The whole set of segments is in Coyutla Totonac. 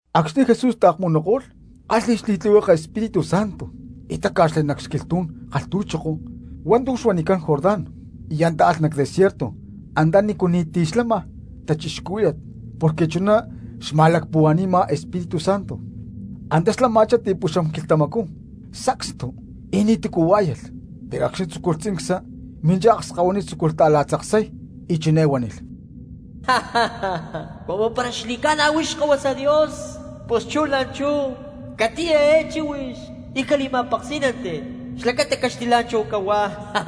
Acxni̠ Jesús taakmunuko̠lh kálhi̠lh xli̠tlihueke Espíritu Santo y táca̠xli nac xquilhtú̠n kalhtu̠choko hua̠ntu̠ xuanicán Jordán y antá alh nac desierto antanícu ni̠ti̠ lama cristianos, porque chuná xma̠lacpuhua̠ni̠ma Espíritu Santo. Antá xlama̠chá ti̠puxam quilhtamacú sacstu y ni̠tu̠cu huá̠yalh, pero acxni̠ tzúculh tzincsa. Minchá akskahuiní y tzúculh ta̠la̠tzaksay y chiné huánilh: —Cumu para xli̠ca̠na huix Xkahuasa Dios, pus chú la̠nchú catiya eé chíhuix y cali̠ma̠peksí̠nanti xlacata caxtilá̠nchahu cahuá.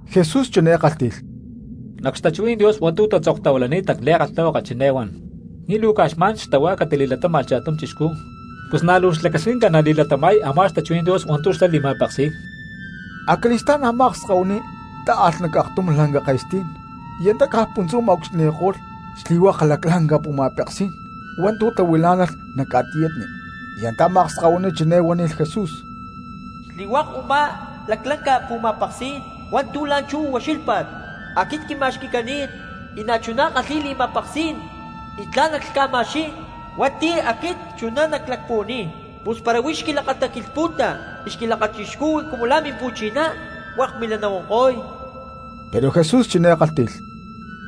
Jesús chiné kálhti̠lh: —Nac xtachuhuí̠n Dios hua̠ntu̠ tatzoktahuilani̠t nac li̠kalhtahuaka chiné huan: “Ni̠ luu caj xma̠n xtahuá catili̠latáma̠lh cha̠tum chixcú, pus na̠ luu xlacasquinca nali̠latama̠y a̠má xtachuhuí̠n Dios hua̠ntu̠ xlá li̠ma̠peksi̠y.” Acali̠stá̠n a̠má akskahuiní tá̠alh nac aktum lanca ke̠stí̠n y antá caj puntzú ma̠ucxilhni̠ko̠lh xli̠hua̠k laclanca pu̠ma̠peksí̠n hua̠ntu̠ tahuilá̠nalh nac ca̠tiyatni. Y antá a̠má akskahuiní chiné huánilh Jesús: —Xli̠hua̠k u̠má laclanca pu̠ma̠peksí̠n hua̠ntu̠ la̠nchú ucxílhpa̠t aquit quima̠xqui̠cani̠t, y na̠chuná ckalhi̠y li̠ma̠peksí̠n y tla̠n nacmacama̠xqui̠y hua̠nti̠ aquit chuná naclacpuhuaniy. Pus para huix xquilakataquilhpu̠ta y xquilakachixcuhui cumu la̠ mimpu̠chiná hua̠k milá nahuanko̠y. Pero Jesús chiné kálhti̠lh: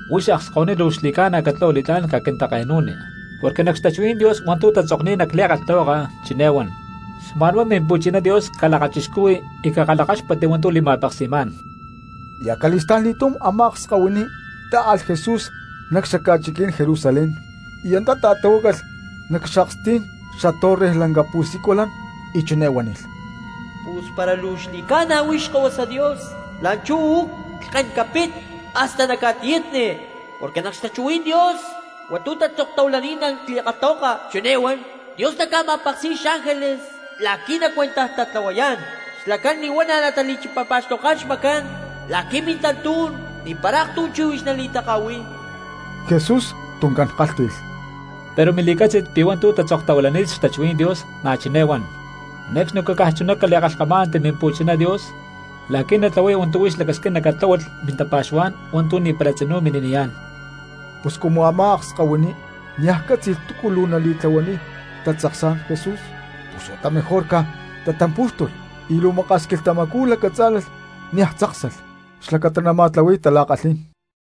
—Huix akskahuiní luu xli̠ca̠na catlahua li̠tlá̠n caquintake̠nu̠ni, porque nac xtachuhuí̠n Dios hua̠ntu̠ tatzokni̠t nac li̠kalhtahuaka chiné huán: “Xma̠nhuá Mimpu̠china Dios calakachixcuhui y cakalhakáxpatti hua̠ntu̠ li̠ma̠peksi̠má̠n.” Y acali̠sta̠nli̠túm a̠má akskahuiní tá̠alh Jesús nac xaca̠chiquí̠n Jerusalén y antá ta̠tahuácalh nac xakstí̠n xatorre lanca pu̠siculan y chiné huánilh: —Pus para luu xli̠ca̠na huix Xkahuasa Dios la̠nchú uú lhken capit hasta nac ca̠tiyátni, porque nac xtachuhuí̠n Dios hua̠ntu̠ tatzoktahuilani̠t nac li̠kalhtahuaka chiné huan: Dios naca̠ma̠peksi̠y xángeles la̠qui̠ nacuentajtatlahuayá̠n. Xlacán li̠huana̠ natali̠chipapa̠xtoká̠n xmacancán la̠qui̠ mintantú̠n ni̠para aktum chíhuix nali̠taka̠hui̠y. Jesús tuncán kálhti̠lh: —Pero na̠ luu mili̠cátzi̠t pi̠ hua̠ntu̠ tatzoktahuilani̠t xtachuhuí̠n Dios na̠ chiné huan: “Ne̠cxni caj chunatá cali̠kalhkamá̠nanti Mimpu̠chiná Dios la̠qui̠ natlahuay hua̠ntu̠ huix lacasquina catláhualh mintapa̠xuhuá̠n hua̠ntu̠ ni̠para tzinú mini̠niyá̠n.” Pus cumu a̠má akskahuiní niaj cátzi̠lh túcu luu natili̠tlahuaniy tatzaksá̠n Jesús pus huata mejor caj tatampú̠xtulh y luu maka̠s quilhtamacú lacatzá̠lalh y niaj tzáksalh xlacata nama̠tlahui̠y tala̠kalhí̠n.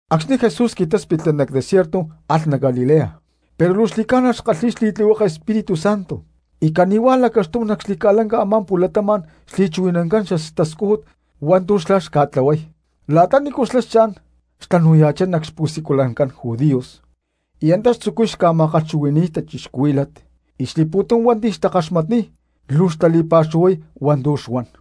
Acxni̠ Jesús qui̠táspitli nac desierto alh nac Galilea, pero luu xli̠ca̠na xkalhi̠y xli̠tlihueke Espíritu Santo y cani̠huá lacaxtum nac xli̠ca̠lanca a̠má pu̠latama̠n xli̠chuhui̠nancán xtascújut hua̠ntu̠ xlá xca̠tlahuay. La̠ta nícu xlá xcha̠n xtanu̠ya̠chá nac xpu̠siculancán judíos y antá xtzucuy ca̠ma̠kalhchuhui̠ni̠y cristianos, y xli̠pu̠tum hua̠nti̠ xtakaxmatniy luu xtali̠pa̠xuhuay hua̠ntu̠ xuan.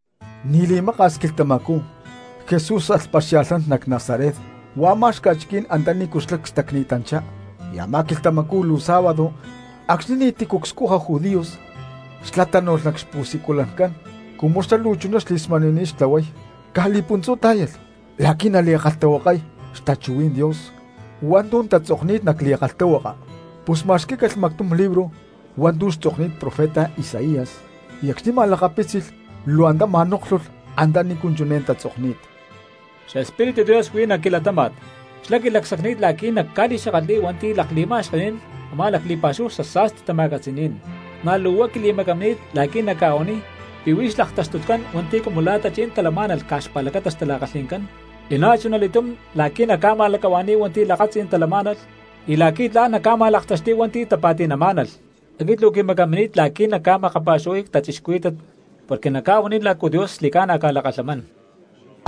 Ni̠ li̠maka̠s quilhtamacú Jesús alh paxia̠lhnán nac Nazaret huá a̠má xca̠chiquí̠n antanícu xlá cstacni̠tanchá. Y a̠má quilhtamacú luu sábado acxni̠ ni̠ti̠cu cscuja judíos, xlá tánu̠lh nac xpusiculancán cumu xlá luu chuná xli̠smani̠ni̠t xtlahuay. Caj li̠puntzú tá̠yalh la̠qui̠ nali̠kalhtahuakay xtachuhuí̠n Dios hua̠ntu̠ tatzokni̠t nac li̠kalhtahuaka. Pus ma̠xquí̠calh mactum libro hua̠ntu̠ xtzokni̠t profeta Isaías, y acxni̠ ma̠lakapítzilh luu antá ma̠nóklhulh antanícu chiné tatzokni̠t: Xespíritu Dios huí nac quilatáma̠t, xlá quilacsacni̠t la̠qui̠ nacca̠li̠xakatli̠y hua̠nti̠ lakli̠ma̠xkení̠n a̠má li̠pa̠xúhu xasa̠sti xtama̠catzi̠ní̠n; na̠ luu huá quili̠macamini̠t la̠qui̠ nacca̠huaniy pi̠ huí xlaktaxtutcán hua̠nti̠ cumu la̠ tachí̠n talamá̠nalh caj xpa̠lacata xtala̠kalhi̠ncán, y na̠chuna li̠túm la̠qui̠ nacca̠ma̠lacahua̠ni̠y hua̠nti̠ lakatzí̠n talamá̠nalh, y la̠qui̠ tla̠n nacca̠ma̠laktaxti̠y hua̠nti̠ tapa̠ti̠namá̠nalh. Aquit luu quimacamini̠t la̠qui̠ nacca̠makapa̠xuhuay cristianos porque nacca̠huaniy lácu Dios xli̠ca̠na ca̠lakalhamán.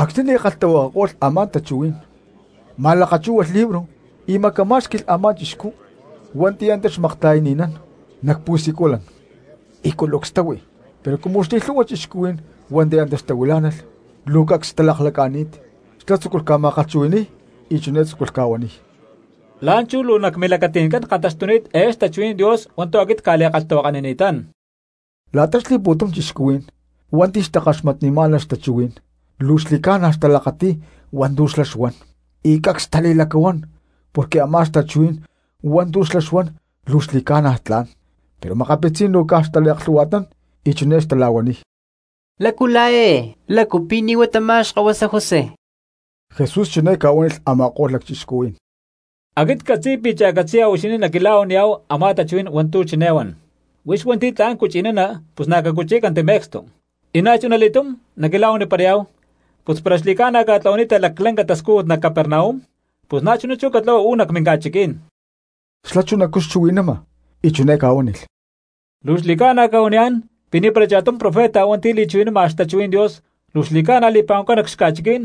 Acxni̠ li̠kalhtahuakako̠lh a̠má tachuhuí̠n ma̠lakachúhualh libro y macamá̠xqui̠lh a̠má chixcú hua̠nti̠ antá xmakta̠yani̠nán nac pu̠siculan y culucs táhui. Pero cumu xli̠lhu̠hua cristianos hua̠nti̠ antá xtahuilá̠nalh luu cacs xtalaklaca̠ni̠t, xlá tzúculh ca̠ma̠kalhchuhui̠ni̠y y chiné tzúculh ca̠huaniy: —La̠nchú luu nac milacati̠ncán kantaxtuni̠t eé xtachuhuí̠n Dios hua̠ntu̠ aquit cca̠li̠kalhtahuakanini̠tán. La̠ta xli̠pu̠tum cristianos hua̠nti̠ xtakaxmatnimá̠nalh xtachuhuí̠n luu xli̠ca̠na xtalakati̠y hua̠ntu̠ xlá xuan, y cacs xtali̠lacahuán porque a̠má xtachuhuí̠n hua̠ntu̠ xlá xuan luu xli̠ca̠na tla̠n. Pero makapitzí̠n luu caj xtaliaklhu̠hua̠tnán y chiné xtala̠huaniy: —¿Lácu la̠ eé? ¿Lácu pi̠ ni̠ huá tamá xkahuasa José? Jesús chiné ca̠huánilh a̠ma̠ko̠lh lacchixcuhuí̠n: —Aquit ccatzi̠y pi̠ cha̠catzi̠ya huixinín naquila̠huaniyá̠hu a̠má tachuhuí̠n hua̠ntu̠ chiné huan: “Huix hua̠nti̠ tla̠n cuchi̠nana pus na̠ cacuchí̠canti me̠cstu.” Y na̠chuna li̠túm naquila̠huaniparayá̠hu: “Pus para xli̠ca̠na ca̠tlahuani̠ta laclanca tascújut nac Capernaum, pus chú na̠chuná catlahua uú nac minca̠chiquí̠n.” Xlá chunacú xchuhui̠nama y chiné ca̠huánilh: —Luu xli̠ca̠na cca̠huaniyá̠n pi̠ ni̠para cha̠tum profeta hua̠nti̠ li̠chuhui̠nama xtachuhuí̠n Dios luu xli̠ca̠na li̠pa̠huancán nac xca̠chiquí̠n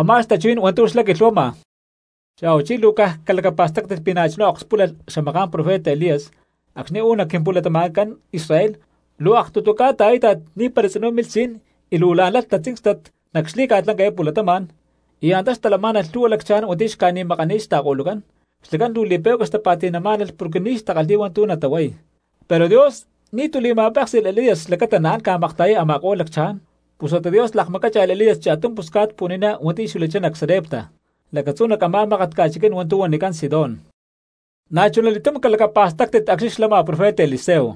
a̠má xtachuhuí̠n hua̠ntu̠ xlá quilhuama. Xa̠huachí luu caj calacapa̠stáctit pi̠ na̠chuná akspúlalh xamaká̠n profeta Elías acxni̠ uú nac quimpu̠latama̠ncán Israel luu aktutu ca̠ta a̠íta̠t ni̠para tzinú milh si̠n y luu la̠n lalh tatzíncstat nac xli̠ca̠lanca eé pu̠latama̠n, y antá xtalamá̠nalh lhu̠hua lacchaján hua̠nti̠ xca̠ni̠makani̠t xta̠ko̠lucán, xlacán luu li̠pe̠cua xtapa̠ti̠má̠nalh porque ni̠ xtakalhi̠y hua̠ntu̠ natahuay, pero Dios ni̠tu̠ li̠ma̠péksi̠lh Elías xlacata naán ca̠makta̠yay a̠ma̠ko̠lh lacchaján, pus huata Dios lakmacácha̠lh Elías cha̠tum pusca̠t pu̠ni̠ná hua̠nti̠ xuilachá nac Sarepta lacatzú nac a̠má mákat ca̠chiquí̠n hua̠ntu̠ huanicán Sidón. Na̠chunali̠túm calacapa̠stáctit acxni̠ xlama profeta Eliseo,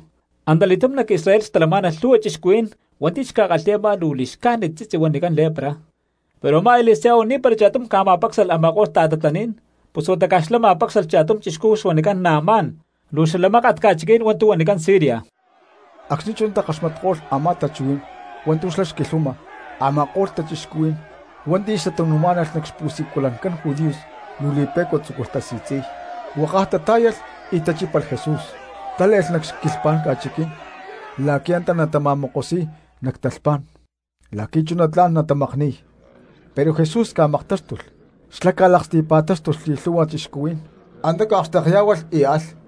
antali̠túm nac Israel xtalamá̠nalh lhu̠hua cristianos hua̠nti̠ xca̠kalhi̠y a̠má luu li̠xcájnit tzitzi huanicán lepra, pero a̠má Eliseo ni̠para cha̠tum ca̠ma̠pácsalh a̠ma̠ko̠lh ta̠tatlaní̠n, pus huata xlá ma̠pácsalh cha̠tum chixcú xuanicán Naamán luu xala mákat ca̠chiquí̠n hua̠ntu̠ huanicán Siria. Acxni̠ chuná takaxmatko̠lh a̠má tachuhuí̠n hua̠ntu̠ xlá xquilhuama, a̠ma̠ko̠lh cristianos hua̠nti̠ xtatanu̠má̠nalh nac xpu̠siculancán judíos luu li̠pe̠cua tzúculh tasi̠tzi̠y. Huákaj tatá̠yalh y tachípalh Jesús, tále̠lh nac xquilhapá̠n ca̠chiquí̠n la̠qui̠ antá natama̠kosuy nac talhpá̠n y la̠qui̠ chuná tla̠n natamakni̠y. Pero Jesús ca̠maktáxtulh, xlá ca̠laksti̠pa̠tánu̠lh xli̠lhu̠hua cristianos, antá ca̠akxtekyá̠hualh y alh.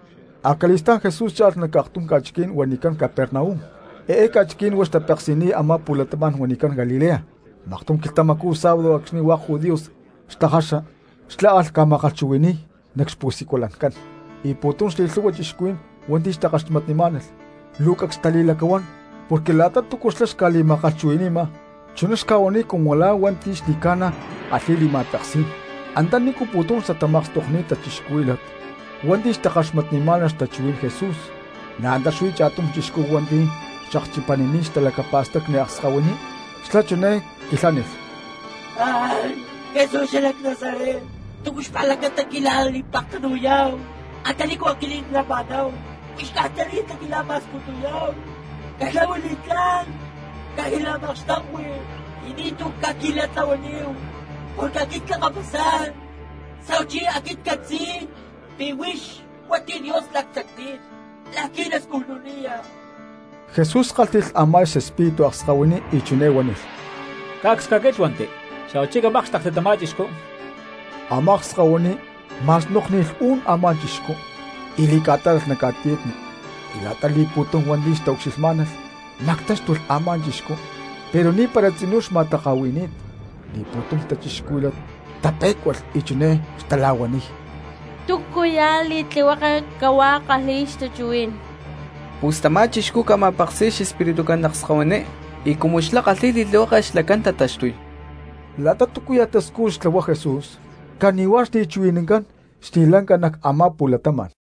Acali̠stá̠n Jesús cha̠lh nac aktum ca̠chiquí̠n huanicán Capernaum, eé ca̠chiquí̠n huá xtapeksi̠niy a̠má pu̠latama̠n huanicán Galilea. Maktum quilhtamacú sábado acxni̠ hua̠k judíos tajaxa xlá alh ca̠ma̠kalhchuhui̠ni̠y nac xpu̠siculancán. Y pu̠tum xli̠lhu̠hua cristianos hua̠nti̠ xtakaxmatnimá̠nalh luu cacs xtali̠lacahuán porque la̠ta túcu xlá xca̠li̠ma̠kalhchuhui̠ni̠ma chuná xca̠huaniy cumu la̠ hua̠nti̠ xli̠ca̠na kalhi̠y li̠ma̠peksí̠n. Antanícu pu̠tum xtatamakstokni̠t cristianos hua̠nti̠ xtakaxmatnimá̠nalh xtachuhuí̠n Jesús na̠ antá xuí cha̠tum chixcú hua̠nti̠ xakchipanini̠t xtalacapa̠stacni akskahuiní. Xlá chiné quilhánilh: —Jesús xalac Nazaret, ¿túcu xlacata quila̠li̠pektanu̠yá̠hu antanícu aquinín clama̠náhu? ¿Huix caj tani̠ta quila̠ma̠sputuyá̠hu? Catlahua li̠tlá̠n caquila̠makxtekui y ni̠tu̠ caquila̠tlahuaníhu, porque aquit clakapasá̠n, xa̠huachí aquit ccatzi̠y pi̠ huix hua̠nti̠ Dios lacsacni̠t la̠qui̠ nascujnaniya. Jesús kálhti̠lh a̠má xespíritu akskahuiní y chiné huánilh: —¡Cacs caquílhuanti, xa̠huachí camákxtekti tamá chixcú! Amá akskahuiní ma̠snókni̠lh u̠n a̠má chixcú y li̠ca̠tálalh nac ca̠tiyatni y la̠ta pu̠tum xtaucxilhmá̠nalh mactáxtulh a̠má chixcú pero ni̠para tzinú xma̠taka̠hui̠ni̠t. Xli̠pu̠tum cristianos tapé̠cualh y chiné xtala̠huaniy: —¿Túcuya̠ li̠tlihueke cahuá kalhi̠y xtachuhuí̠n? Pus tamá chixcú ca̠ma̠peksi̠y xespiritucán akskahuiní y cumu xlá kalhi̠y li̠tlihueke xlacán tataxtuy. La̠ta túcuya̠ tascújut xtlahuay Jesús cani̠huá xli̠chuhui̠nancán xli̠ca̠lanca nac a̠má pu̠latama̠n.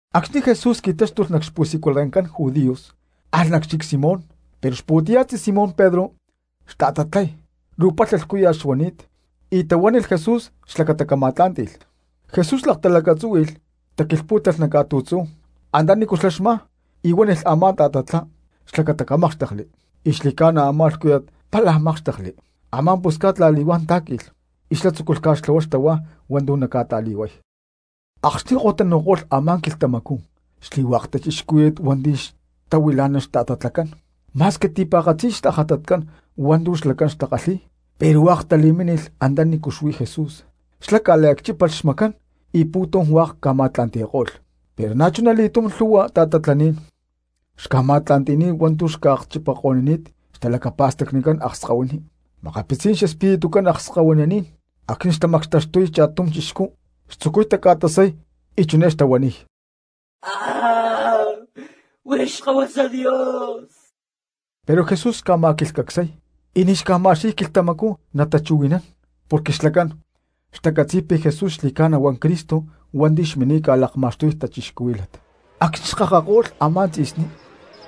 Acxni̠ Jesús qui̠táxtulh nac xpu̠siculancán judíos alh nac xchic Simón. Pero xpu̠tiya̠tzí Simón Pedro xta̠tatlay luu palha lhcúya̠t xuani̠t, y tahuánilh Jesús xlacata xlá cama̠tlá̠nti̠lh. Jesús laktalacatzúhui̠lh taquilhpú̠talh nac ca̠tu̠tzú antanícu xlá xmá y huánilh a̠má tajátat xlacata camákxtekli. Y xli̠ca̠na a̠má lhcúya̠t pálaj mákxtekli, a̠má pusca̠t la̠li̠huán tá̠qui̠lh y xlá tzúculh ca̠xtlahuay xtahuá hua̠ntu̠ naca̠ta̠li̠huay. Acxni̠ ko̠tanu̠ko̠lh a̠má quilhtamacú xli̠hua̠k cristianos hua̠nti̠ xtahuilá̠nalh xta̠tatlacán ma̠squi ti̠pa̠katzi tajátat hua̠ntu̠ xlacán xca̠kalhi̠y pero hua̠k tali̠mínilh antanícu xuí Jesús. Xlá ca̠liacchípalh xmacán y pu̠tum hua̠k ca̠ma̠tla̠nti̠ko̠lh. Pero na̠chuna li̠túm lhu̠hua ta̠tatlaní̠n xca̠ma̠tla̠nti̠y hua̠nti̠ xca̠akchipaniko̠ni̠t xtalacapa̠stacnicán akskahuiní. Makapitzí̠n xespiritucán akskahuininí̠n acxni̠ xtamactaxtuniy cha̠tum cristiano xtzucuy taca̠tasay y chiné xtahuaniy: —¡Huix Xkahuasa Dios! Pero Jesús xca̠ma̠quilhcacsay y ni̠ xca̠ma̠xqui̠y quilhtamacú natachuhui̠nán porque xlacán xtacatzi̠y pi̠ Jesús xli̠ca̠na huá Cristo hua̠nti̠ xmini̠t ca̠lakma̠xtuy cristianos. Acxni̠ xkakako̠lh a̠má tzi̠sní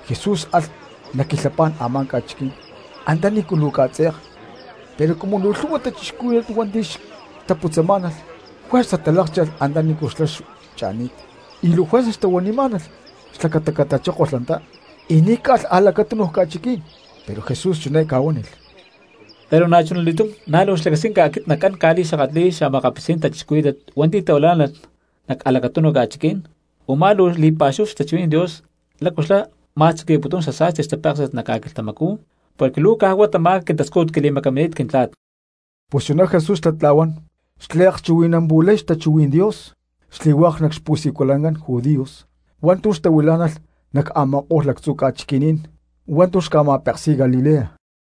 Jesús alh nac xquilhapá̠n a̠má ca̠chiquí̠n antanícu luu ca̠tze̠k, pero cumu luu lhu̠hua cristianos hua̠nti̠ xtaputzamá̠nalh juerza talákcha̠lh antanícu xlá xcha̠ni̠t y luu juerza xtahuanimá̠nalh xlacata catachókolh antá y ni̠ caalh a̠lacatúnuj ca̠chiquí̠n. Pero Jesús chiné ca̠huánilh: —Pero na̠chuna li̠túm na̠ luu xlacasquinca aquit nacán ca̠li̠xakatli̠y xa̠makapitzí̠n cristianos hua̠nti̠ tahuilá̠nalh nac a̠lacatúnuj ca̠chiquí̠n u̠má luu li̠pa̠xúhu xtachuhuí̠n Dios lácu xlá ma̠tzuqui̠putún xasa̠sti xtapéksi̠t nac ca̠quilhtamacú, porque luu caj huá tamá quintascújut quili̠macamini̠t Quintla̠t. Pus chuná Jesús xlatla̠huán xliakchuhui̠nampu̠lay xtachuhuí̠n Dios xli̠hua̠k nac xpu̠siculancán judíos hua̠ntu̠ xtahuilá̠nalh nac a̠ma̠ko̠lh lactzu̠ ca̠chiquí̠n hua̠ntu̠ xca̠ma̠peksi̠y Galilea.